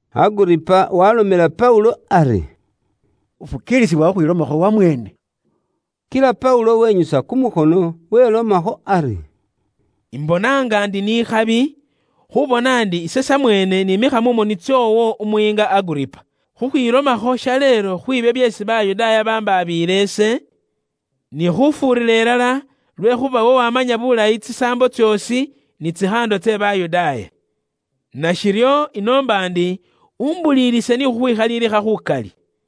Aguripa waalomela Paulo ari, “Ufukiilisibwa khukhwilomakho wamweene.” Kila Paulo wenyusa kumukhono, welomakho ari: “Imbona nga ndi ni ikhabi, khuubona ndi ise samweene niimikha mu moni tsoowo, umuyiinga Aguripa, khukhwilomakho shaleelo khwiibyo byeesi Bayudaaya bambaabiile ise, ni khufuurira ilala lwekhuuba iwe wamanya bulayi tsisaambo tsoosi, ni tsikhaando tse Bayudaaya. Nashiryo, inoomba ndi umbulilise ni khukhwikhalilikha khukali.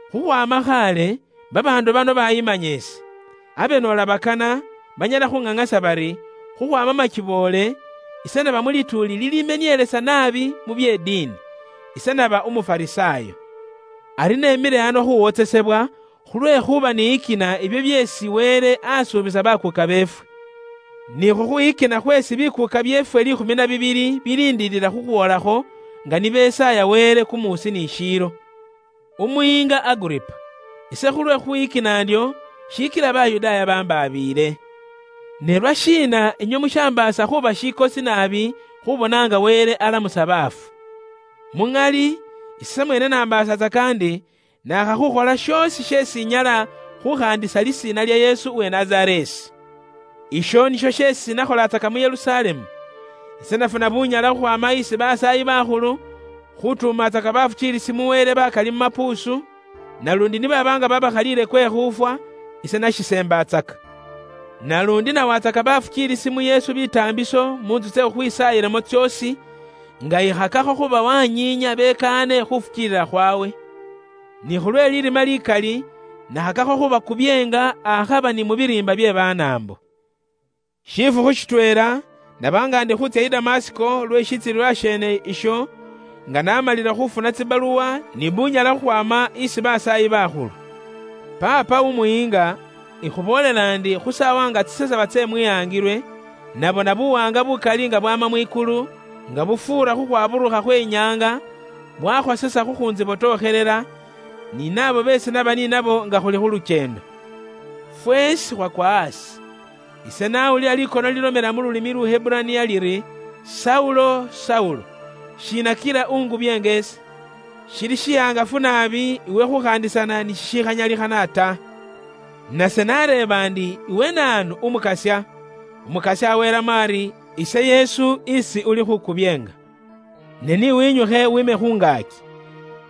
Khukhwaama khaale, babaandu bano bayimanya ise. Abe noola bakana, banyala khuŋaŋasa bari, khukhwaama makiboole, ise n'aba mu lituuli lilimenielesa naabi mu bye diini. Ise n'aba Umufarisaayo. Ari nemile ano khuwotsesebwa khulwekhuuba niyikina ibyo byeesi Wele asuubisa bakuuka beefwe. Ni khukhwiyikina khweesi bikuuka byeefwe liikhumi na bibili biliindilila khukhwoolakho, nga ni besaaya Wele kumuusi ni shiilo. Umuyiinga Aguripa, ise khulwe khukhwiyikina ndyo, shikila Bayudaaya bambaabiile. Ne lwashiina inywe mushinyoola khuuba shihangafu khushifukiilisa muri Wele alamusa baafu? “Muŋali, ise samweene nambaasatsaka ndi naakha khukhola shoosi sheesi inyala khukhaandisa lisiina lya Yesu uwe Nazareesi. Isho nisho sheesi ise nakholatsaka mu Yerusalemu. Ise nafuna bunyala khukhwaama isi basaayi bakhulu, khutuumatsaka bakhosefu ba Wele bakali mu mapuusu, naluundi ni baaba nga babaakhalile kwe khuufwa, ise nashiseembatsaka. Naluundi ise nawatsaka bafukiilisi mu Yesu bitaambiso mu ntsu tsye khukhwisaayilamo tsoosi, nga ikhakakho khubawanyiinya bafwotsole Wele. Ni khulwe lirima likali nakhakakho khubakubyeenga akhaba ni mu biriimba bye Banaambo.” “Shifukhu shitweela naba nga ndi khuutsya i Damasiko lwe shitsilililwa sheene isho, nga namalile khufuna tsibaluwa ni bunyala khukhwaama isi basaayi bakhulu. Paapa umuyiinga, ikhuboolela ndi khu saawa nga tsisesaba tse mwihangilwe, nabona buwaanga bukali nga bwama mwikulu, nga bufuura khukhwaburukha khwe nyaanga, bwakhosesa khukhuntsibotokhelela, ni naabo beesi naba ni nabo nga khuli khu lukyeendo. Feesi khwakwa aasi. Ise nawulila likono lilomela mu lulimi Luheburaniya liri, ‘Saulo, Saulo, shiina kila ungubyeenga ise? Shili shiwaangafu naabi iwe khukhaandisana ni shishikhanyalikhana ta!’ Nase nareeba ndi, ‘Iwe naanu Umukasya?’ Umukasya welamo ari, ‘Ise Yesu isi uli khuukubyeenga. Ne ni winyukhe wiime khu ngaaki.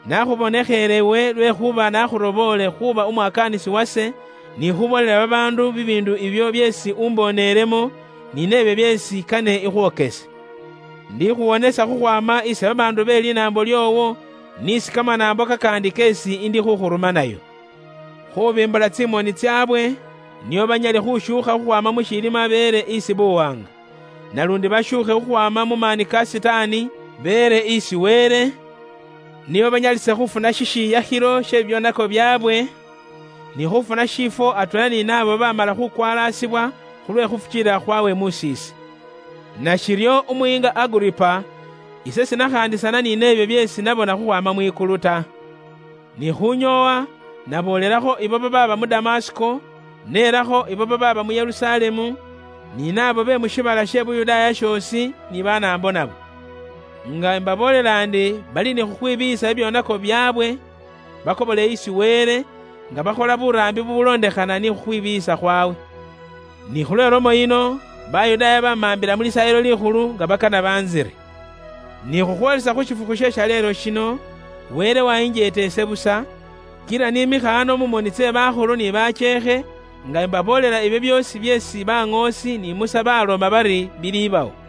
Nakhubonekhele iwe lwekhuuba nakhuroboole khuuba umwakaanisi wase, ni khuboolela babaandu bibiindu ibyo byeesi umboonelemo, ni nebyo byeesi kane ikhwokese. Ndikhuwonesa khukhwaama isi babaandu be linaambo lyoowo, n'isi kamanaambo kakaandi keesi indikhukhurumanayo. Khubimbula tsimoni tsaabwe, nio banyale khushuukha khukhwaama mu shilima beele isi buwaanga. Naluundi bashuukhe khukhwaama mu maani ka Sitaani, beele isi Wele, nio banyalise khufuna shishiyakhilo she bibyoonako byaabwe, ni khufuna shiifwo atweela ni bakhosefu khulwe khufukiilila khwawe mus'iise.’” “Nashiryo umuyiinga Aguripa, ise siingane ikhaandisana ni nebyo byeesi nabona khukhwaama mwikulu ta. Ni khunyoowa naboolelakho ibo babaaba mu Damasiko, nelakho ibo babaaba mu Yerusalemu, ni naabo be mu shiibala she Yuda shoosi, ni Banaambo nabo. Nga mbaboolela ndi bali ni khukhwibiiyisa bibyoonako byaabwe bakobole isi Wele, nga bakhola buraambi bubulondekhana ni khukhwibiiyisa khwawe. Ni khulwe lomo yino Bayudaaya bamaambila mu Lisaayilo Likhulu nga bakana bantsire. Ni khukhwoolisa khu shifukhu she shaleelo shino, Wele wayinjeeta ise busa, kila niimikha ano mu moni tse bakhulu ni bakyeekhe nga imbaboolela ibyo byoosi byeesi baŋoosi ni Musa baaloma bari bilibawo.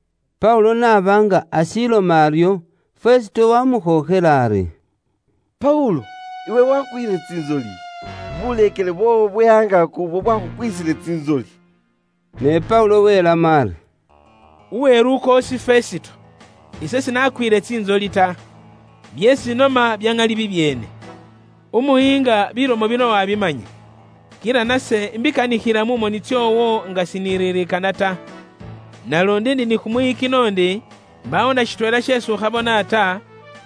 Paulo n'aba nga ashiloma aryo, Fesito wamukhookhela ari, “Paulo iwe wakwiile tsintsoli. Buleekele bwoowo bwe angaaki ubwo bwakhukwisile tsintsoli.” Ne Paulo welamo ari, “Uwelukoosi Fesito, ise sinakwiile tsintsoli ta. Byeesi inoma bya ŋali bibyeene. Umuyiinga bilomo bino wabimanya. Kila nase mbikanikhila mu moni tsoowo nga siniririkana ta. Naluundi ndi ni kumwiyikino ndi mbaawo na shitweela sheesi ukhabona ta,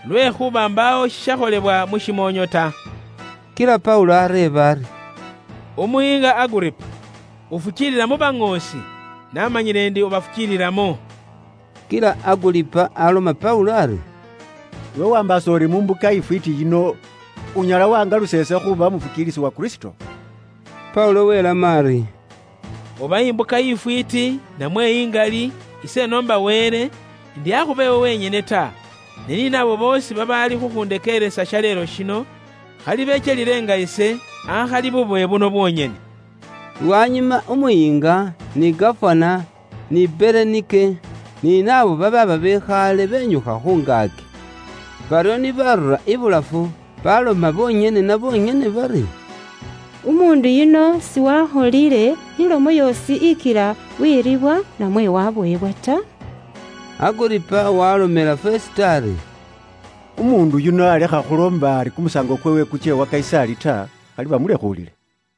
lwekhuuba mbaawo shishakholebwa mu shimoonyo ta.” Kila Paulo areeba ari: “Umuyiinga Aguripa, ufukiilila mu baŋoosi? Naamanyile ndi ubafukiililamo.” Kila Aguripa aloma Paulo ari, “Iwe waambaasa uri mu mbuka ifwiiti yino, unyala waangalusa ise khuuba umufukiilisi uwa Kristo?” Paulo weelamo ari, “Oba imbuka ifwiiti, namwe ingali, ise inoomba Wele, ndi akhuba iwe wenyene ta, ne ni naabo boosi babaali khukhundekeeresa shaleelo shino, khali bekyelile nga ise, akhali bubowe buno bwonyene.” Lwanyuma umuyiinga, ni gafana ni Berenike, ni naabo babaaba bekhale benyukha khu ngaaki. Baryo ni barura ibulafu, baloma bonyene na bonyene bari, “Umuundu yuno siwakholile ilomo yoosi ikila weribwa namwe wabowebwa ta.” Aguripa waalomela Fesito ari, “Umuundu yuno alekha khuloomba ari kumusaango kweewe kutsye wa Kayisaali, khali bamulekhuulile.”